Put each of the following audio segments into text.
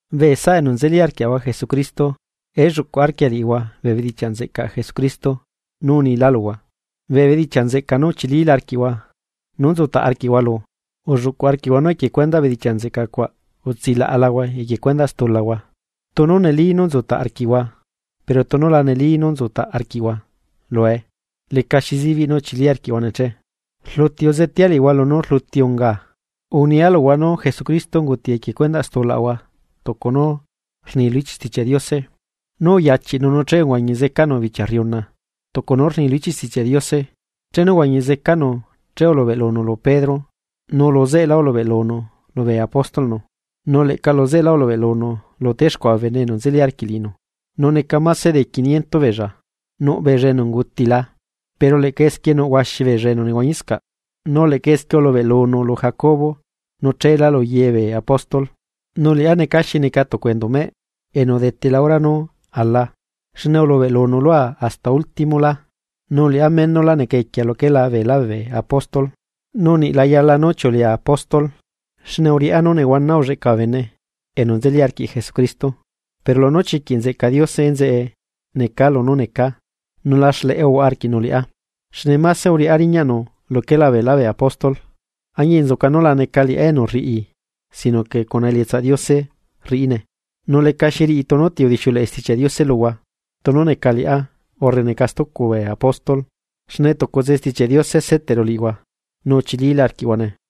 Bee saꞌa enu nzeli arquiaꞌahua Jesucristo, elluꞌcuꞌ arquia liꞌihua bee bedichiaꞌ nzeꞌcaꞌ Jesucristo nú unila luhua, bee bedichiaꞌ nzeꞌca nú uchilila arquiꞌhua nú nzutaꞌ arquiꞌhua lu. Ulluꞌcuꞌ arquiꞌhua nú equie cuendaꞌ bedichiaꞌ nzeꞌca cuaꞌ utsilaꞌalahua equie cuendaꞌ stulahua, tunu neli nú nzutaꞌ arquiꞌhua pero tunu la neli nú nzutaꞌ arquiꞌhua lue lecaxi zibiꞌ nú uchili arquiꞌhuane che. Rluti uzetea liꞌihua lunú rluti ungaa. Unia luhua nú Jesucristo unguti equie cundaꞌ stulaꞌahua tucu nú rni lu ichiꞌ Stichiaꞌ Diose. Nu uyachiꞌnu nu che uhuañi zecanu bichia rriuna, tucu nú rni lu ichiꞌ Stichiaꞌ Diose. Chenu uhuañi zecanu che ulubeꞌlunu lu Pedro nu luzeꞌelá ulubeꞌlunu lubee apóstolꞌnu. Nu leꞌca luzeꞌelá ulubeꞌlunu lu texcuaꞌa bee bene enu nzeli arquiꞌ liꞌinu, nu neca máse de quiniento beella. Nuꞌbeella enu ungutila, pero leꞌca esquie nuꞌ huaxi beella enu nehuañiscaꞌ. Nu leꞌca esquie ulubeꞌlunu lu Jacobo nu cheelá lu ye bee apóstol. Nu liꞌá neca xi neca tucu enduꞌmeꞌ enu udetela hora nú ala, xne ulubeꞌlunu lua hasta últimolá. Nu liꞌá menula neca equia luquela beelá bee apóstol, nu niꞌ la yala nú chiulea apóstol xne uriꞌá nú nehuana ulleꞌca bee bene enu nzeli arquiꞌ Jesucristo. Pero lunú chiquiꞌ nzeꞌca Diose enzeꞌe necaa lunú necaa, nu la xleꞌe uhuaꞌa arquiꞌnu liꞌá xne máse uriꞌá riñaꞌnu luquela beelá bee apóstol, añinzuca nú la neca liꞌá enu rriꞌi sino que cuna elietsaꞌ Diose rriꞌine. Nu lecaxi riꞌi tunu ti udixiuleꞌe Stichiaꞌ Diose luhua, tunu neca liꞌá urre neca stucu bee apóstol, xne tucutse Stichiaꞌ Diose seteꞌru liꞌihua nu uchilila arquiꞌhuane.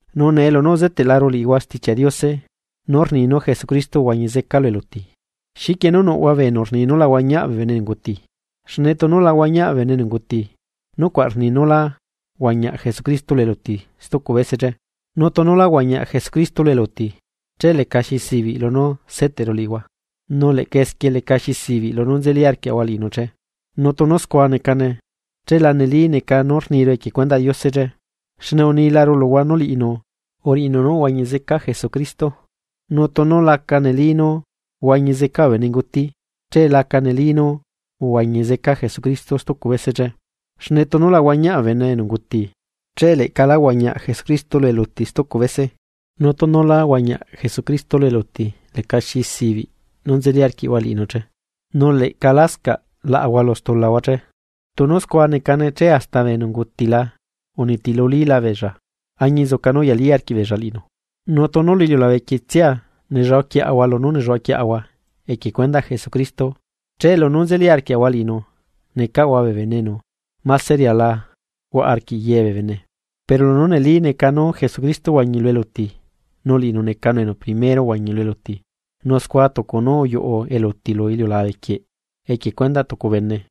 Nu nee lunú uzeteꞌlaru liꞌihua Stichiaꞌ Diose nú rni nú Jesucristo uhuañi zeca lu eluti, ¿xiquie nú nuꞌhua bee enu rni nú la huañiaꞌ bee bene enu unguti? Xne tunu la huañiaꞌ bee bene enu unguti, nucuaꞌ rni nú lá huañiaꞌ Jesucristo lu eluti stucu bese che. Nu tunu lá huañiaꞌ Jesucristo lu eluti, che lecaxi zibiꞌ lunú seteꞌru liꞌihua, nu leꞌca esquie lecaxi zibiꞌ lunú nzeli arquiꞌhua liꞌinu che. Nu tunu scua necane, che la neli neca nú rniru equie cuendaꞌ Diose che xne unilaru luhua nú liꞌinu uriꞌinu nú uhuañi zeca Jesucristo. Nu tunu laca neli nú huañi zeca bee benenguti, che laca neli nú uhuañi zeca Jesucristo stucu bese che. Xne tunu la huañiaꞌ bee bene enu unguti, che leꞌca lá huañiaꞌ Jesucristo lu eluti stucu bese. Nu tunu lá huañiaꞌ Jesucristo lu eluti lecaxi zibiꞌ nú nzeli arquiꞌhua liꞌinu che, nu leꞌca lascaꞌ laꞌahua lu stulahua che. Tunu scua necane che hasta bee enu ungutila unitilulila beella, añinzuca nú uyali arquiꞌbeella liꞌinu. Nu tunu lu iliulabequietsia nelluaquiaꞌahua lunú nelluaꞌaquiaꞌahua equie cuendaꞌ Jesucristo, che lunú nzeli arquiaꞌahua liꞌinu necaꞌahua bee bene enu máse riala huaꞌa arquiꞌ ye bee bene. Pero lunú neli neca nú Jesucristo uhuañi lu eluti, nu liꞌinu necanu enu primero uhuañi lu eluti. Nu scua tucu nú uyuꞌu eluti lu iliulabe quieꞌ, equie cuendaꞌ tucu bene,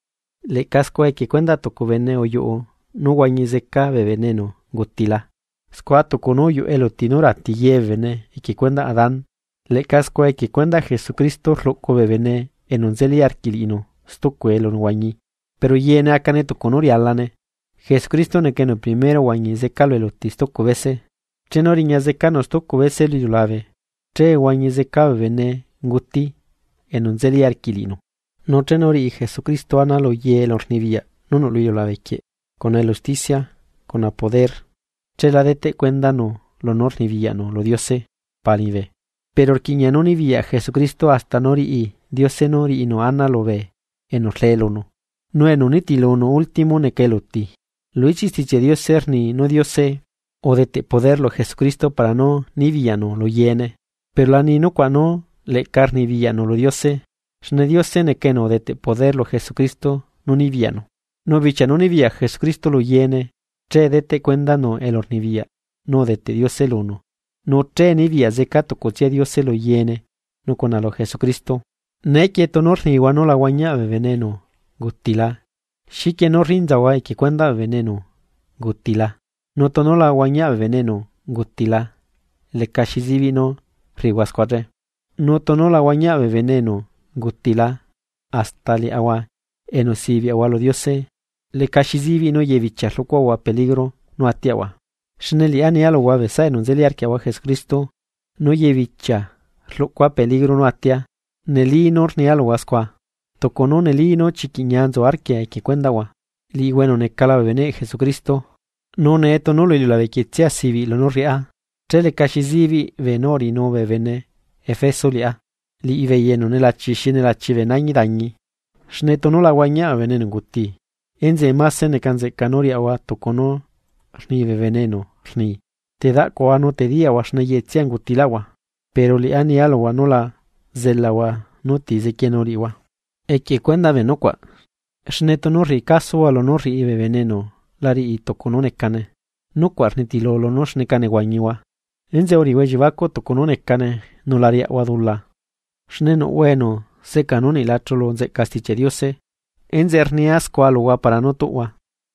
leꞌca scua equie cuendaꞌ tucu bene uyuꞌu nú huañi zeca bee bene enu ungutila. Scua tucu nú uyuꞌu eluti nú rati ye bee bene equie cuendaꞌ Adán, leꞌca scua equie cuendaꞌ Jesucristo rluꞌcu bee bene enu nzeli arquiꞌ liꞌinu stucu elunehuañi. Pero yeene acane tucu nú rialane. Jesucristo neca enu primero uhuañi zeca lu eluti stucu bese, chenu riñazecanu stucu bese lu iliulabe che huañi zeca bee benenguti enu nzeli arquiꞌ liꞌinu. Nu chenu riꞌi Jesucristo ana luye elurnibiyaꞌ nú nuꞌ lu iliulabe quieꞌ cuna elusticia cuna poder, chela deteꞌ cuendanu lunú rnibiyaꞌnu lu Diose Pa liñibe. Pero rquiꞌña nú nibiyaꞌ Jesucristo hasta nú riꞌi Diose nú riꞌinu ana lubee enu rlee lunu. Nu enu nitilunu último neca eluti. Lu ichiꞌ Stichiaꞌ Diose rni nú Diose udeteꞌ poder lu Jesucristo para nú nibiyaꞌnu lu yeene, pero la ni nucuaꞌ nú leꞌca rnibiyaꞌnu lu Diose, xne Diose neca enu udeteꞌ poder lu Jesucristo nú nibiyaꞌnu. Nu bichia nú nibiyaꞌ Jesucristo lu yeene, che deteꞌ cuendanu elurnibiyaꞌ nú udeteꞌ Diose lunu nu che nibiyaꞌ zeca tucutsia Diose lu yeene nu cuna lu Jesucristo. Neequie tunu rnihua nú la huañiaꞌ bee bene enu ungutila. ¿Xiquie nú rrinzahua equie cuendaꞌ bee bene enu ungutila? Nu tunu la huañiaꞌ bee bene enu ungutila lecaxi zibiꞌ nú rriꞌihua scua che. Nu tunu la huañiaꞌ bee bene enu ungutila, hasta liaꞌahua enu sibiaꞌahua lu Diose lecaxi zibiꞌ nú yebichia rluꞌcuaꞌahua peligro nú atiaꞌahua. Xne liꞌá nia luhua bee saꞌa enu nzeli arquiaꞌahua Jesucristo nú yebichia rluꞌcua peligro nú atia, neli nú rnia luhua scua, tucu nú neli nú chiquiꞌ ñia nzu arquia equie cuendaꞌhua, liꞌihua enu necala bee beneꞌ Jesucristo. Nu nee tunu lu iliulabequietsia sibiꞌ lunú rriꞌá, che lecaxi zibiꞌ beenú uriꞌinu bee bene Efeso liꞌá, liꞌibeei enu nelachi xi nelachi bee nañi dañi. Xne tunu la huañiaꞌ bee bene enu unguti enzeꞌe máse neca nzeꞌca nú riaꞌahua tucu nú rni bee enu rni: “Te daꞌcuaꞌahua nu te diyaꞌahua xne yeꞌetsia ungutilaꞌahua.” Pero liꞌá nia luhua nu la zelahua nú ti zequienu liꞌihua equie cuendaꞌ bee nucuaꞌ. Xne tunu rriꞌi casuhua lunú rriꞌi bee bene enu la riꞌi tucu nú necane, nucuaꞌ rnitilu lunú xneca nehuañihua. Enzeꞌe uriꞌihua elliebacuꞌ tucu nú necane nu la riaꞌhua dula xne nuꞌhua enu seꞌcaa nú niꞌ la chulu nzeꞌca Stichiaꞌ Diose, enzeꞌe rnia scua luhua para nú tuꞌhua.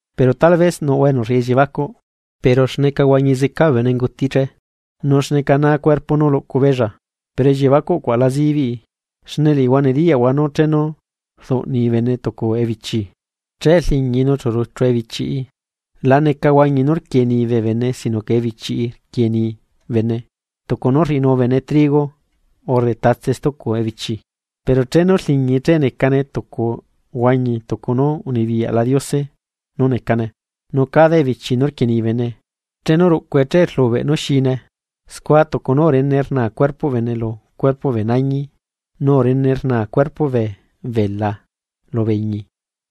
Pero tal vez nuꞌhua enu rriꞌi elliebacuꞌ: “¿Pero xneca huañi zeca bee benenguti che? ¿Nu xneca naa cuerpo nú luꞌcu beella?” ¡Pero elliebacuꞌ cuaꞌ la zibiꞌi! Xne liꞌihua nediyaꞌhua nú chenu rduꞌni bene tucu ebichi che rliñii nu chu ruchu ebichiꞌi. La neca huañi nú rquieni bee bene sino que ebichiꞌi rquieni bene, tucu nú rriꞌinu bene trigo urre tatse stucu ebichi. Pero chenu rliñii che necane tucu huañi tucu nú unibiyaꞌla Diose nú necane, nu cada ebichi nú rquieni bene, chenu ruꞌcue che rlubeꞌ nú xine. Scua tucu nú urene rnaa cuerpoꞌ bene lu cuerpoꞌ bee nañi nu urene rnaa cuerpoꞌ bee bela lubee iñi.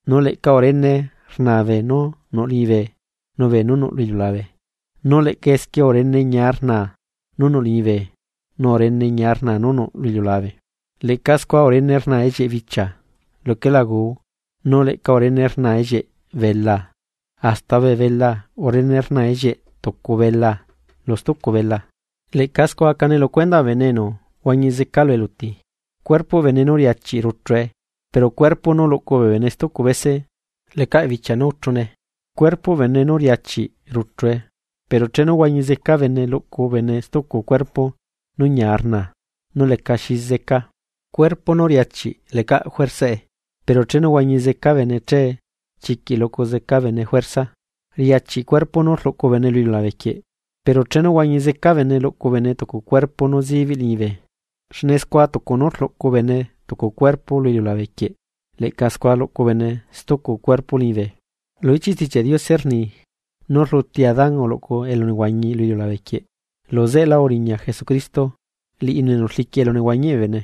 Nu leꞌca urene rnaa beenú nuꞌ liñibe nu beenú nuꞌ lu iliulabe nu leꞌca esquie urene ñia rnaa, nú nuꞌ liñibe nu urene ñia rnaa nú nuꞌ lu iliulabe. Leꞌca scua urene rnaa ellieꞌ bichia luquela guu nu leꞌca urene rnaa ellieꞌ belaa, hasta bee belaa urene rnaa ellieꞌ tucu belaa, lu stucu belaa. Leꞌca scua acane lu cuendaꞌ bee bene enu huañi zeca lu eluti, cuerpoꞌ bene nú riachiꞌ ruchue, pero cuerpo nú luꞌcu bee bene stucu bese lecaꞌ bichia nú uchune. Cuerpoꞌ bene nú riachiꞌ ruchue, pero chenu huañi zeca bene luꞌcu bene stucu cuerpo nú ñia rnaa nu lecaꞌ xi zeca. Cuerpo nú riachiꞌ lecaꞌ juersaꞌe, pero chenu huañi zeca bene che chiquiꞌ luꞌcu zeca bene juerza. Riachiꞌ cuerpo nú rluꞌcu bene lu iliulabe quieꞌ, pero chenu huañi zeca bene luꞌcu bene tucu cuerpo nú zibiꞌ liñibe. Xne scua tucu nú rluꞌcu bene tucu cuerpo lu iliulabe quieꞌ leꞌca scua luꞌcu bene stucu cuerpo liñibe. Lu ichiꞌ Stichiaꞌ Diose rni nú rluti Adán uluꞌcu elunehuañi lu iliulabe quieꞌ. Luzeꞌelá uriña Jesucristo, liꞌinu enu rliquiꞌ elunehuañiꞌ bee bene.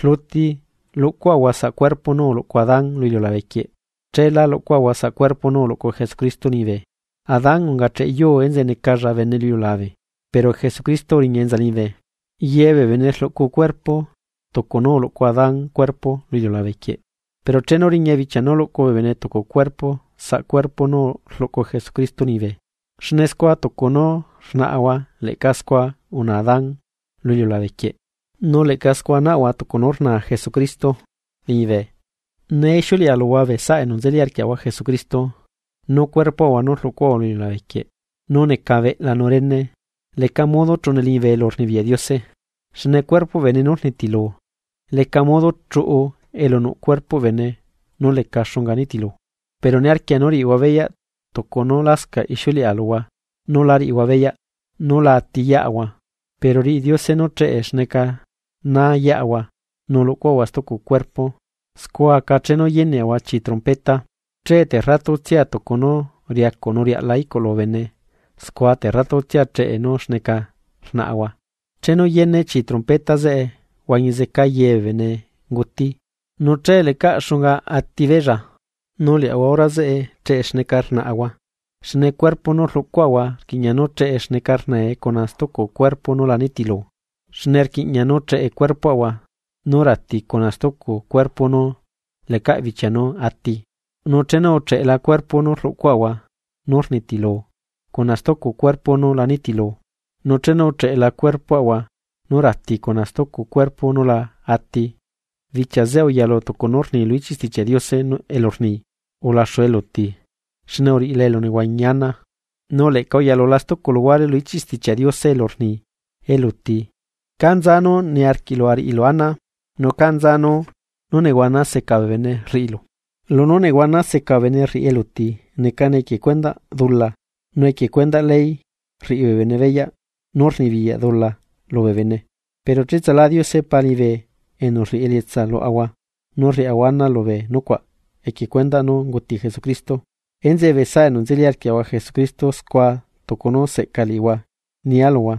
Rluti luꞌcuaꞌahua saꞌ cuerpo nú uluꞌcu Adán lu iliulabe quieꞌ, chéla luꞌcuaꞌahua saꞌ cuerpo nú uluꞌcu Jesucristo liñibe. Adán ungacheꞌ yuu enzeꞌe necalla bene lu iliulabe, pero Jesucristo uriña enza liñibe. Yebee bene rluꞌcu cuerpo tucu nú uluꞌcu Adán cuerpo lu iliulabequieꞌ, pero chenu riña bichia nú luꞌcu bee bene tucu cuerpo saꞌ cuerpo nú rluꞌcu Jesucristo liñibe. Xne scua tucu nú rnaꞌahua leꞌca scua unaa Adán lu iliulabe quieꞌ, nu leꞌca scua naꞌahua tucu nú rnaa Jesucristo liñibe. Nee ixiuleꞌa luhua bee saꞌa enu nzeli arquiaꞌahua Jesucristo, nú cuerpoꞌahua nú rluꞌcuaꞌahua lu iliulabe quieꞌ nú neca beꞌla nu rene leca modo chuꞌune liñibe elurnibiyaꞌ Diose. Xne cuerpoꞌ bene nú rnitilu, leca modo chuꞌu elu nuꞌ cuerpoꞌ bene nú leca xunga nitilu. Pero niarquia nú riꞌihua beyaꞌ tucu nú lascaꞌ ixiuleꞌa luhua nú lá riꞌihua beyaꞌ, nú la atiyeꞌahua, pero riꞌi Diose nú cheꞌe xneca naa yeꞌahua nu luꞌcuaꞌahua stucu cuerpo. Scua aca chenu yeneꞌahua chii trompeta, che terratutsia tucu nú riacuꞌ nu riaꞌla iꞌculu bene scua terratutsia cheꞌe nú xneca rnaꞌahua, chenu yene chii trompeta zeꞌe huañi zeca yee bee benenguti, nu che lecaꞌ xunga atibeella, nu liaꞌahua hora zeꞌe cheꞌe xneca rnaꞌahua. Xne cuerpo nú rluꞌcuaꞌahua rquiꞌña nú cheꞌe xneca rnae cuna stucu cuerpo nú la nitilu. Xne rquiꞌña nú cheꞌe cuerpoꞌahua nú rati cuna stucu cuerpo nú lecaꞌ bichia nú ati. Nu chenu ucheꞌela cuerpo nú rluꞌcuaꞌahua nú rnitilu cuna stucu cuerpo nú la nitilu, nu chenu ucheꞌela cuerpoꞌahua nú rati cuna stucu cuerpo nú la ati, bichia zeꞌe uyalu tucu nú rni lu ichiꞌ Stichiaꞌ Diose elu rni: “Ulaxu eluti xne uriꞌila elunehuañi ana. Nu leꞌca uyalula stucu luguare lu ichiꞌ Stichiaꞌ Diose elu rni: “Eluti, ¿ca nza nú niarquiꞌlu ariꞌilu ana? ¿Nu ca nza nú nehuana seca bee bene rriꞌilu?” Lunú nehuana seca bee bene rriꞌi eluti necane equie cuendaꞌ dula, nu equie cuendaꞌ ley rriꞌi bee bene beyaꞌ nú rnibiyaꞌ dula lubee bene. Pero cheꞌtsala Diose Pa liñibe, enu rriꞌi elietsa luaꞌahua nú rriaꞌahua ana lubee nucuaꞌ equie cuendaꞌ nú unguti Jesucristo. Enzeꞌe bee saꞌa enu nzeli arquiaꞌahua Jesucristo scua tucu nú seꞌca liꞌihua nia luhua,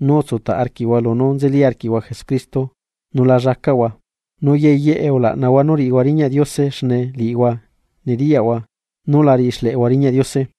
nú utsutaꞌ arquiꞌhua lunú nzeli arquiꞌhua Jesucristo nu la llacaꞌhua. Nu ye yeꞌe ulaꞌnahua nú riꞌihua riñaꞌ Diose xne liꞌihua nediyaꞌhua nú la riꞌi xleꞌehua riñaꞌ Diose.